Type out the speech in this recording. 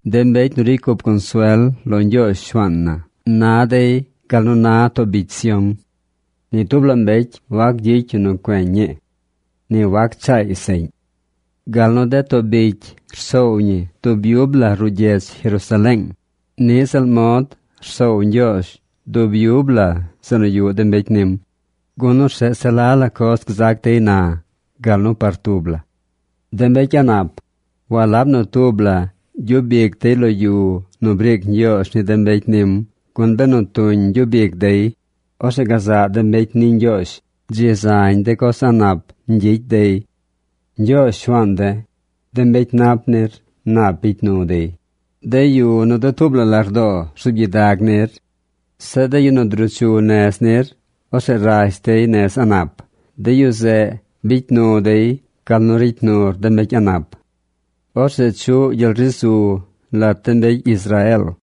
De mbecy nu ricy cup consuel lo Ñgyoozh, Shuaan na, na dey gal nu na too bicy Sión. Ni tub la mbecy wac gyicy yu nu cueñ ñi. Ni wac chaay seꞌñ. Gal nu de too bicy rsoow ñi dub yub la ruꞌ gyedz Jerusaleeng, niꞌ ziꞌl mod rsoow Ñgyoozh dub yub la zeꞌ nu yuꞌ de mbecy nim, gun orzeꞌ se la la coz gzac dey na, gal nu par tub la. De mbecy a̱ꞌ nap, walab nu tub la gyub ic dey lo yu nu briic Ñgyoozh ni de mbecy nim, gun benu tuñ ñgyub ic dey, orzeꞌ gazaꞌ de mbecy ni Ñgyoozh dzi zañ de coz a̱ꞌ nap ñgyicy dey. Ñgyoozh, Shuaan de̱, de mbecy nap nir nap bicy nu dey, de yu nu dutuub la lardoo rzuub gyidag nir. Zeꞌ de yu nu druu chu nez nir, orzeꞌ rash dey nez a̱ꞌ nap. De yu zeꞌ bicy nu dey gal nu ricy nur de mbecy a̱ꞌ nap. Orzeꞌ chuꞌ gyel ri zu lat de mbecy Israeel.